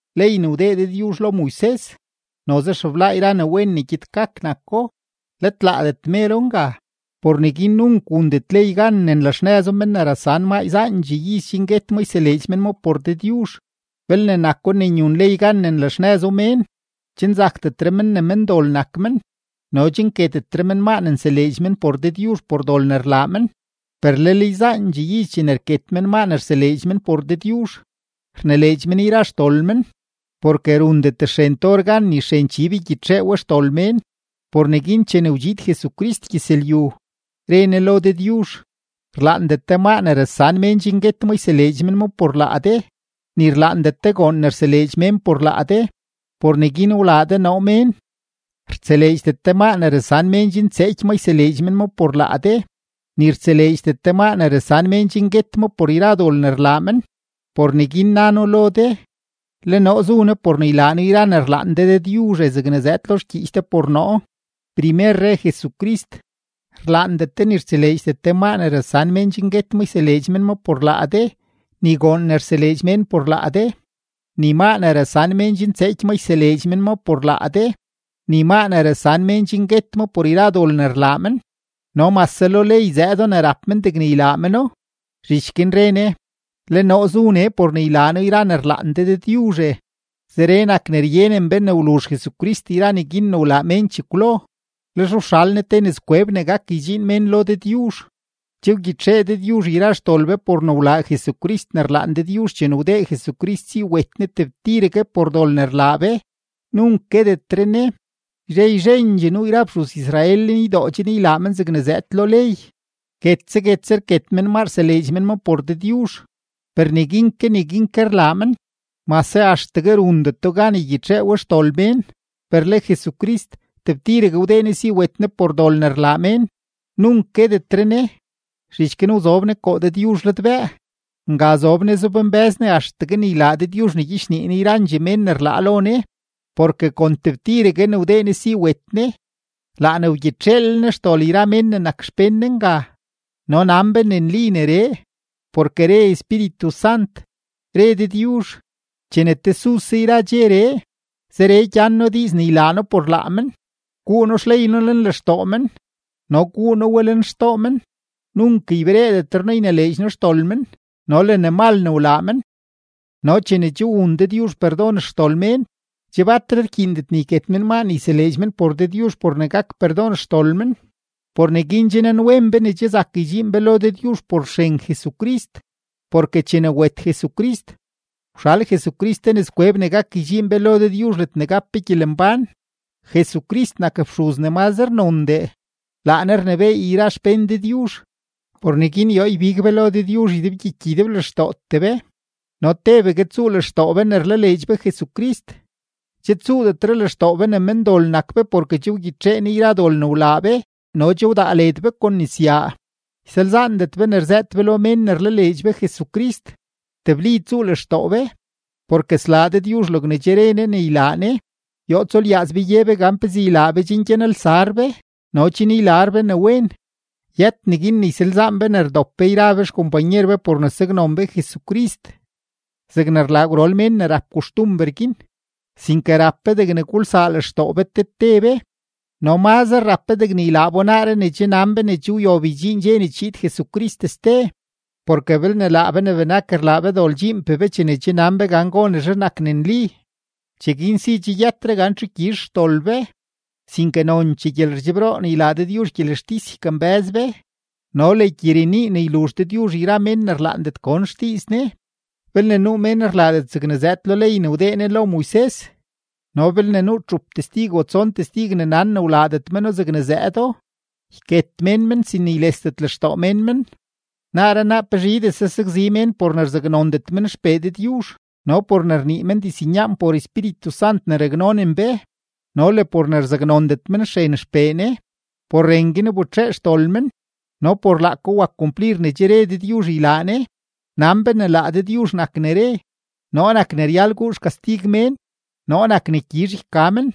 Ley ne wdee Dëdyuzh lo Moises, noze xeblaa yra ne wen ne gyed gak nako, let laadet mero nga. Por neguin nunk wundet ley gan ne nlaxnëzo men ne rasan maa yzaandxee iz chen guet ma yseleedx men ma por Dëdyuzh. Belne nako ne nyun ley gan ne nlaxnëzo mén, che nzakdetre men ne mendol nak men no che nketetre men maa ne nseleedx men por Dëdyuzh por dol ne rlaa men. Per lel yzaandxee iz chene rket men maa ne rseleedx men por Dëdyuzh, rnileedx men yra xdol men, porke rundet xren tor gan ni xren chib ygyitxee we xdol mén. Por neguin chene wdxiid Jesucrist gyëzlyu, re Ne lo Dëdyuzh: Rlaandet de maa ne rasan mén chen guet ma yseleedx men ma por laa de, ni rlaandet de goon ne rseleedx mén por laa de, por neguin wlaa de noo mén. Rtseleedxdet de maa ne rasan mén chen tseeky ma yseleedx men ma por laa de, ni rtseleedxdet de maa ne rasan mén chen guet ma por yra dol ne rlaa men. Por neguin na noo lo de: “Le noo zu nee por ne ylaa noo yra ne rlaan de Dëdyuzhe, zegne zëëdo lo xgyiich de por noo.” Primer re Jesucrist: “Rlaandet de ni rtseleedxdet de maa ne rasan mén chen guet ma yseleedx men ma por laa de, ni goon ne rseleedx mén por laa de, ni maa ne rasan mén chen tseeky ma yseleedx men ma por laa de, ni maa ne rasan mén chen guet ma por yra dol ne rlaa men”, no mase lo ley zëëdo ne rap men degne ylaa meno. Zhich guin re Ne: “Le noo zu nee por ne ylaa noo yra ne rlaan de Dëdyuzhe.” Zeree nak ne ryenen be ne wluzh Jesucrist yra neguin ne wlaa mén chekwlo, lex wxal Ne te nëzkweb ne gak ydxiin mén lo Dëdyuzh. Che wgyitxee Dëdyuzh yra xdol be por ne wlaa Jesucrist ne rlaan Dëdyuzh chene wdee Jesucrist si wet Ne tebtiregue por dol ne rlaa be, nunk guetetre Ne. Yzhe yzhendxee nuu yra fxuz-Israel lenydoo chen ylaa men zegne zëëd lo ley, guetse guetse rket men maa rseleedx men ma por Dëdyuzh, per neguin ke neguin ke rlaa men, mase axtegue rundeto gan ygyitxee we xdol mén. Per le Jesucrist, tebtiregue wdee Ne si wet Ne por dol ne rlaa mén, nunk guetetre Ne, zhich guin wzob Ne koo Dëdyuzh ladbëë. Nga zob Ne zobmbë́z Ne axtegue ne ylaa Dëdyuzh ne gyichnii Ne yrandxee mén ne rlaa lo Ne. Porke kon tebtiregue ne wdee Ne si wet Ne, laa ne wgyitxeelel Ne xdol yra mén ne nak xpén Ne nga. No nan be ne nli neree, porke re Espíritu Sant: Re Dëdyuzh: Chene tesuse yra dxeree, zeree gyan noo diiz ne ylaa noo por laa men: Guu noo xley noo lenlextoo men no guu noo we lenxtoo men. Nunk ybereedetre noo ynileedx noo xdol men no le ne mal ne wlaa men. No chene che wun Dëdyuzh perdon xdol mén, che batre rkyiindet ne yket men maa ne yseleedx men por Dëdyuzh por ne gak perdon xdol men. Por neguin che nanwen be ne che zak ydxiin be lo Dëdyuzh por xren Jesucrist, porke chene wet Jesucrist, wxal Jesucrist te nëzkweb ne gak ydxiin be lo Dëdyuzh ledne gap be gyelembán. Jesucrist nak fxuz ne mazre nondee, laa Ne rnebééy yra xpén Dëdyuzh. Por neguin yoo ybig be lo Dëdyuzh ydebgyiky ydeblextootee be no tebegue tsuu lextoo be ne rlaleedx be Jesucrist, che tsuudetre lextoo be ne mendol nak be porke che wgyitxee Ne yra dol ne wlaa be no che wdaa led be kon nisnya. Ysalzaandet be ne rzëët be lo mén ne rlaleedx be Jesucrist, tebli tsuu lextoo be, porke slaa Dëdyuzh logne che re Ne ne ylaa Ne. Yoo tsulyaaz be ye be gan pezee ylaa be chen gyanelsar be no chen ylar be ne wen. Yët neguin ne ysalzaan be ne rdop be yra be xkompanyer be por ne saknon be Jesucrist, zegne rlaa gwrol mén ne rap koxtumber guin, sinke rap be degne gulsaa lextoo be te te be, no mazre rap be degne ylaa bo naaree ne che nan be ne che wyob ydxiin dxe ne chiid Jesucrist ste. Porke belne laa be ne benak rlaa be dol dxiinpee be chene che nan be gan gonezhe nak ne nli, cheguin si che yëtre gan txu gyizh xdol be, sinke nonchee gyelerdxebroo ne ylaa Dëdyuzh gyelextis ykambë́z be no le gyirenii ne yluzh Ne yra mén ne rlaandet gon xdiiz Ne. Belne nuu mén rlaadet zegne zëëd lo ley ne wdee Ne lo Moises no belne nuu txup testig o tson testig ne nan ne wlaadet meno zegne zëëdo, yket mén men sin ne ylesdet lextoo mén men. Naaree naa pezhidese sakzi mén por ne rzaknondet men XPee Dëdyuzh no por ne rnii men diznyaan por Espíritu Sant ne raknonen be no le por ne rzaknondet men xren XPee Ne; por ren guin wbetxee xdol men no por laako wak kumplir ne che re Dëdyuzh ylaa Ne. Nan be ne laa Dëdyuzh nak ne re: “Noo nak ne ryal guu xkastig mén; noo nak ne gyizh yka men.”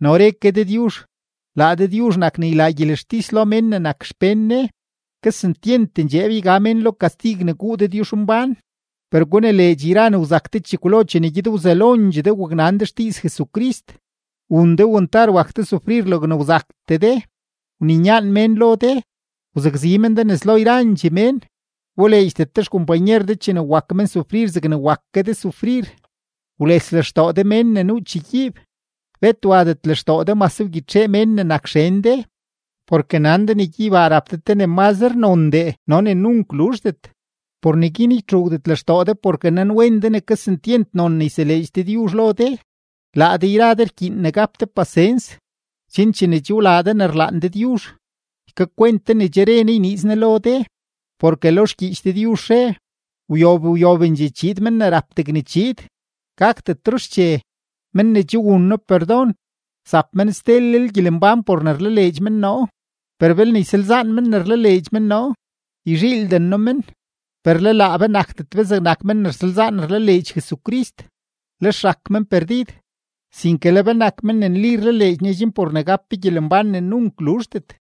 No re ke Dëdyuzh: “Laa Dëdyuzh nak ne ylaa gyelextis lo mén ne nak xpén Ne.” ¡Kesentyent ndxeeb yga mén lo kastig ne guu Dëdyuzhmbán! Per gunileedx yra ne wzak de chekwlo chene gyed wzelondxee de waknan de xdiiz Jesucrist, wun de wantar wak de sufrir logne wzaktee de. Wninyaan mén lo de, wzakzi men de nes lo yrandxee mén, wboleedxdet de xkompanyer de chene wak men sufrir zegne wak ke de sufrir, wles lextoo de mén ne nuu chegyiib, bet wadet lextoo de mase wgyitxee mén ne nak xen de, porke nan de ne gyeybaa rap de te ne mazre nondee no ne nunk luzhdet. Por neguin ytxuugdet lextoo de porke nanwen de ne kesentyent non ne yseleedx Dëdyuzh lo de. Laa de yra de rkyiin ne gap de pasens, chen chene che wlaa de ne rlaan Dëdyuzh, ykakwent de ne che re Ne yniiz Ne lo de. Porke lo xgyiich Dëdyuzh re: Wyob wyobendxee chiid men ne rap degne chiid, gakdetro xche. Men ne che wun noo perdon, zap men stelel gyelembán por ne rlaleedx men noo, per belne ysalzaan men ne rlaleedx men noo, yzhiilden noo men. Per le laa be nakdet be zegnak men ne rsalzaan rlaleedx Jesucrist, lex rak men perdid, sinke le be nak men ne nli rlaleedx Ne chen por ne gap be gyelembán ne nunk luzhdet.